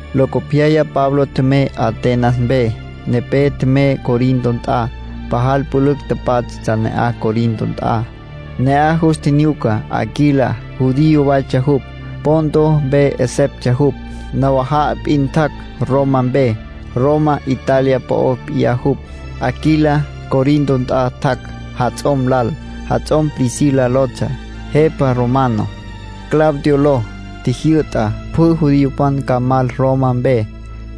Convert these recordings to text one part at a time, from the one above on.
Locopyaya Pablo tjemey Atenas mpe. Nepé tjemey Corinto nt'a. Pajal pülücj pátjatsja ne'aj, Corinto nt'a. Ne'aj jus tjinyuca Aquila. Judío waytsja jupj. Ponto mpe 'eseptsja jupj. Nawaja'a p'in tjac' Roma mpe, Roma Italia po'o p'iyá jupj. Aquila Corinto nt'a tjac' jats'om lal, jats'om Priscila lotsja. Jepa romano, Claudio ló, tjijyü'ta pjü judiopan ca mal Roma mpe,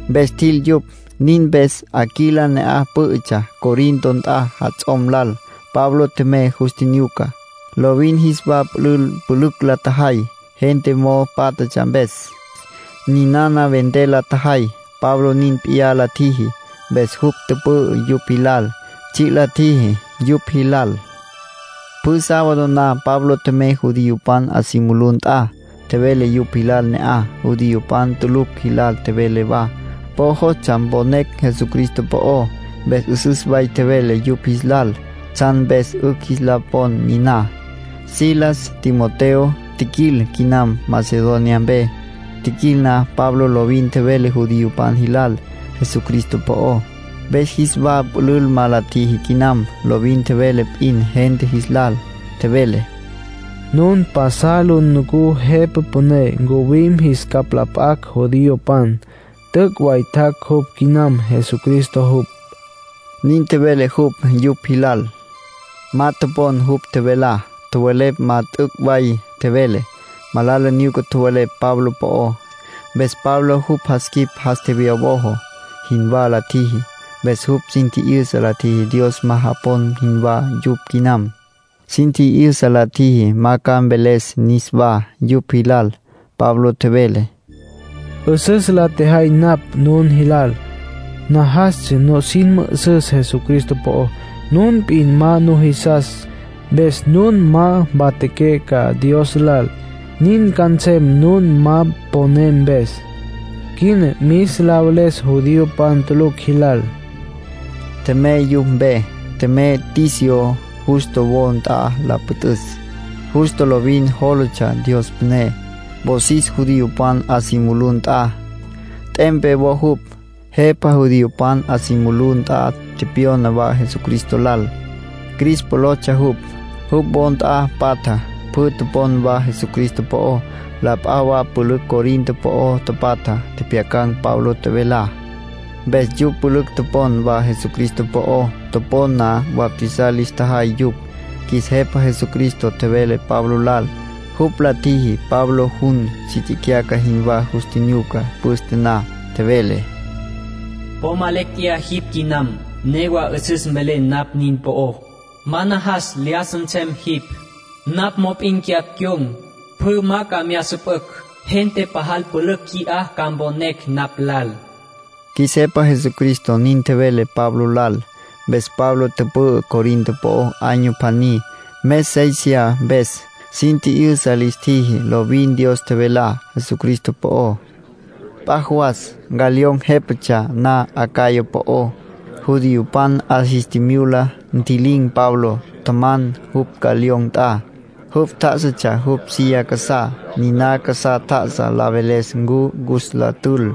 mpes tjil yupj. Nin mpes Aquila ne'aj pǘ'ütsja Corinto nt'a jats'om lal. Pablo tjemey yus tjinyuca. Lovin jis wa pülül pülücj la tjajay, gente mo'o pátjatsja mpes. Ninana vender la tjajay. Pablo nin p'iyá la tjiji. Mpes jupj tüpü'ü yupj jilal, tsji' la tjiji yupj jilal. Pjü sábado na Pablo tjemey judiopan 'a si mulú nt'a. Tjevele yupj jilal ne'aj, judiopan tulucj jilal tjevele wa. Po jostsja mponecj Jesucristo po'ó, mpes 'üsüs way tjevele yupj jis lal tsjan mpes 'ücj jis la pon niná. Silas, Timoteo tjiquil quinam Macedonia mpe. Tjiquil na, Pablo lovin tjevele judiopan jilal Jesucristo po'ó. Mpes jis wa pülül ma la tjiji quinam, lovin tjevele p'in gente jis lal. Tjevele: “Nun pasal lu nucú Jepa Püné ncuwim jis capj la p'acj judiopan. T'üc' way tjac' jupj quinam. Jesucristo jupj”, nin tjevele jupj yupj jilal. Ma topon jupj tjevelá. Tjowelepj ma t'üc' way tjevele. Malala nyuca tjowelepj Pablo po'ó. Mpes Pablo jupj jas quip jas tjewyawojo jinwá la tjiji. Mpes jupj sin tji'yüsa la tjiji Dios ma japon jinwá yupj quinam. Sin tji'yüsa la tjiji ma ca mveles niswá yupj jilal. Pablo tjevele: “'Üsüs la tjejay napj nun jilal. Najastsja nusin mü'üsüs Jesucristo po'ó. Nun p'in ma nujisas. Mpes nun ma mpatjaqué ca Dios lal. Nin ca nsem nun ma poné mpes. Quina mis la veles judiopan tulucj jilal”, nin tjevele. Tjemey yupj mpe. Tjemey Ticio Justo wo nt'a la püt'üs. Justo lovin jólatsja Dios püné. Wosis judiopan 'a si mulú nt'a, t'empe wo jupj. Jepa judiopan 'a si mulú nt'a tepyona wa Jesucristo lal. Crispo lotsja jupj. Jupj wo nt'a patja, pjü topon wa Jesucristo po'ó. La p'a wa pülücj Corinto po'o tapatja tjepjyacan̈ Pablo tjevelá. Mpes yupj pülücj topon wa Jesucristo po'ó. Topon na, bautizar lis tjajay yupj. Qjuis Jepa Jesucristo tjevele Pablo lal. Jupj la tjiji Pablo jun si tsicyaca jinwá jus tjinyuca püste na. Tjevele: “Po ma lecj tjeyá jipj quinam. Newa 'üsüs mvelen napj nin po'ó. Ma najas lyájasa nsem jipj. Napj mop'in cyapj cyon̈. Pjü ma ca mya süpücj. Gente pajal pülücj qui'á ca mponecj napj lal”, qjuis Jepa Jesucristo nin tjevele Pablo lal. Mpes Pablo tüpü'ü Corinto po'ó año pjaní, mes séisiya mpes. Sin tji'yüsa lis tjiji lovin Dios tjevelá Jesucristo po'ó. P'a jawas, Galión jépatsja na Acaya po'ó, judiopan 'a jis tjimyula, ntji'lin̈ Pablo. Tjaman jupj Galión nt'a. Jupj tjá'asatsja jupj silla casá, niná casá tjá'asa la veles ncu cus la tül.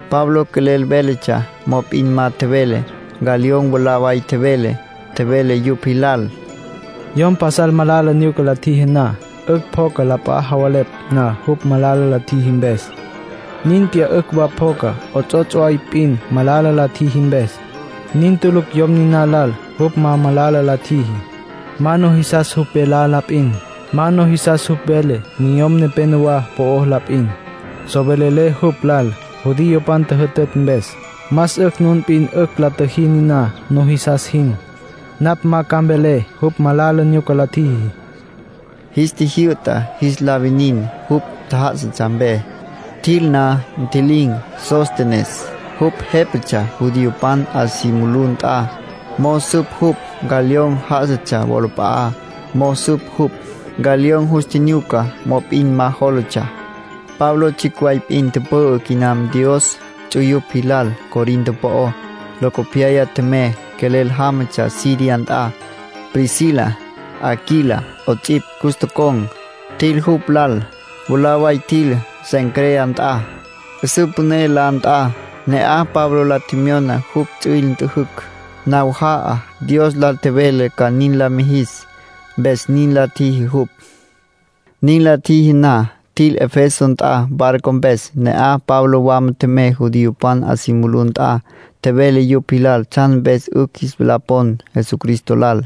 Pablo quelel véletsja, mop'in ma tjevele. Galión mwalá way tjevele. Tjevele yupj jilal: —Yom pasal malala nyuca la tjiji na, 'ücj pjocas la p'a javelepj na jupj malala la tjiji mpes. Nin p'iyá 'ücj wa pjocas 'ots'ots' way p'in malala la tjiji mpes. Nin tulucj yom niná lal. Jupj ma malala la tjiji. Ma nujisas jupj velá la p'in. Ma nujisas jupj vele niyom nepenowá po'ó la p'in. So velelé jupj lal judiopan tjüjütütj mpes. Más 'ücj nun p'in 'ücj la tjüjí niná, nujisas jin. Napj ma ca mvelé jupj malala nyuca la tjiji —Galión nin tjevele. Jis tjijyü'ta jis la winin jupj tjá'asatsja mpe. Tjil na, ntji'lin̈ Sóstenes. Jupj jépatsja judiopan 'a si mulú nt'a. Mo'o süp jupj, Galión já'asatsja wolap'a'á mo'o süp jupj. Galión jus tjinyuca, mop'in ma jólatsja. Pablo tsjicj way p'in tüpü'ü quinam Dios ts'uyupj jilal Corinto po'ó. Locopyaya tjemey. Quelel jámatsja Siria nt'a. Priscila, Aquila 'ots'ipj, cus tocon̈, tjil jupj lal. Mwalá way tjil Cencrea nt'a, 'üsǘ püné la nt'a. Ne'aj Pablo la tjemyona jupj ts'üil nt'üjücj. Nawaja'a Dios lal tjevele ca nin la mijis, mpes nin la tjiji jupj. Nin la tjiji na, tjil Efeso nt'a barco mpes. Ne'aj Pablo wama tjemey judiopan 'a si mulú nt'a, tjevele yupj jilal tsjan mpes 'ücj jis la pon Jesucristo lal.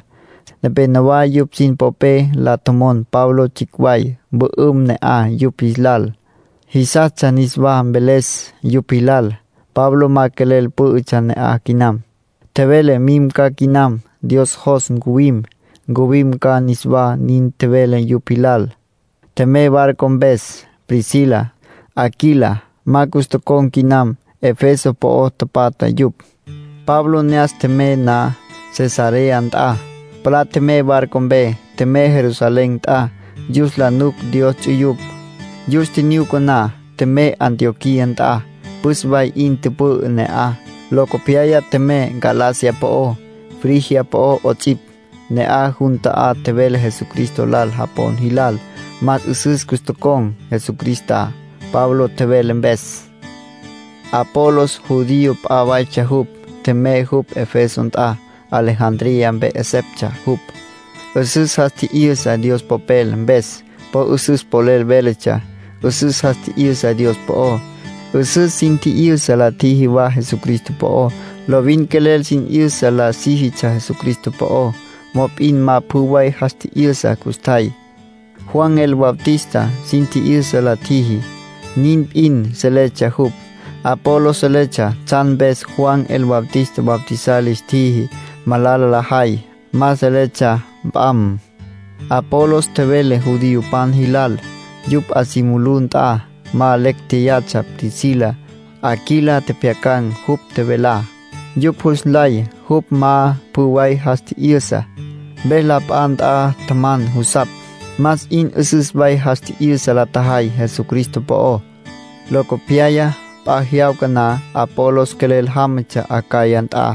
Nepénowa yupj sin popé la tjomon Pablo tsjicj way mpü'üm ne'aj yupj jis lal. Jisastsja niswá mveles yupj jilal. Pablo ma quelel pǘ'ütsja ne'aj quinam. Tjevele mim ca quinam. Dios jos ncuwim, ncuwim ca niswá, nin tjevele yupj jilal. Tjemey barco mpes. Priscila, Aquila, ma cus tocon̈ quinam. Efeso po'o tapatja yupj. Pablo ne'as tjemey na Cesarea nt'a, palá tjemey barco mpe. Tjemey Jerusalén nt'a yus la nuc Dios ts'uyupj. Yus tjinyuca na, tjemey Antioquía nt'a. Püs way 'in tüpü'ü ne'aj. Locopyaya tjemey Galacia po'ó, Frigia po'ó 'ots'ipj. Ne'aj jun ta'á tjevele Jesucristo lal japon jilal. Más 'üsüs cus tocon̈ Jesucristá, Pablo tjevele mpes. Apolos judío p'a waytsja jupj. Tjemey jupj Efeso nt'a. Alejandría mpe 'eseptsja jupj. 'Üsüs jas tji'yüsa Dios Popel mpes. Po 'üsüs polel véletsja. 'Üsüs jas tji'yüsa Dios po'ó. 'Üsüs sin tji'yüsa la tjiji wa Jesucristo po'ó. Lovin quelel sin 'yüsa la síjitsja Jesucristo po'ó. Mop'in ma pjü way jas tji'yüsa custjay. Juan el Bautista sin tji'yüsa la tjiji, nin p'in seletsja jupj. Apolos seletsja tsjan mpes Juan el Bautista bautizar lis tjiji malala lajay. Ma seletsja p'am. Apolos tjevele judiopan jilal, yupj 'a si mulú nt'a. Ma lecj jéyatsja. Priscila, Aquila, tjepjyacan̈ jupj tjevelá. Yupj jus nlay jupj ma pjü way jas tji'yüsa. Mpes la p'a nt'a tjaman jusapj, más 'in 'üsüs way jas tji'yüsa la tjajay Jesucristo po'ó. Locopyaya, p'a jyawca na, Apolos quelel jámatsja Acaya nt'a.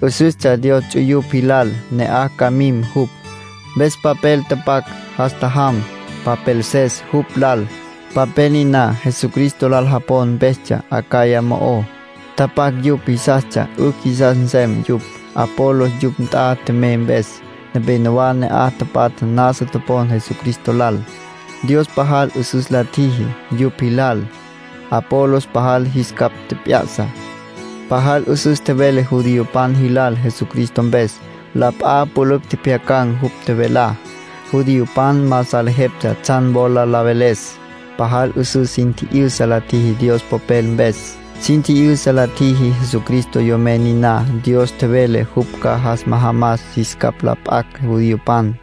'Üsüstsja Dios ts'uyupj jilal ne'aj ca mim jupj, mpes papel tapac, jas tjajam popelses jupj lal. Papel niná Jesucristo lal japon mpestsja Acaya mo'ó. Tapac yupj jisastsja 'ücj jisas nsem yupj, Apolos yupj nt'a tjemey mpes. Nepénowa ne'aj tapatja nasa topon Jesucristo lal. Dios pajal 'üsüs la tjiji yupj jilal. Apolos pajal jis capj tjep'ya'sa. Pajal 'üsüs tjevele judiopan jilal Jesucristo mpes. La p'a pülücj tjepjyacan̈ jupj tjevelá. Judiopan ma salejeptsja tsjan wola la veles. Pajal 'üsüs sin tji'yüsa la tjiji Dios Popel mpes. Sin tji'yüsa la tjiji Jesucristo Yomen niná Dios tjevele jupj ca jas majamas jis capj la p'acj judiopan.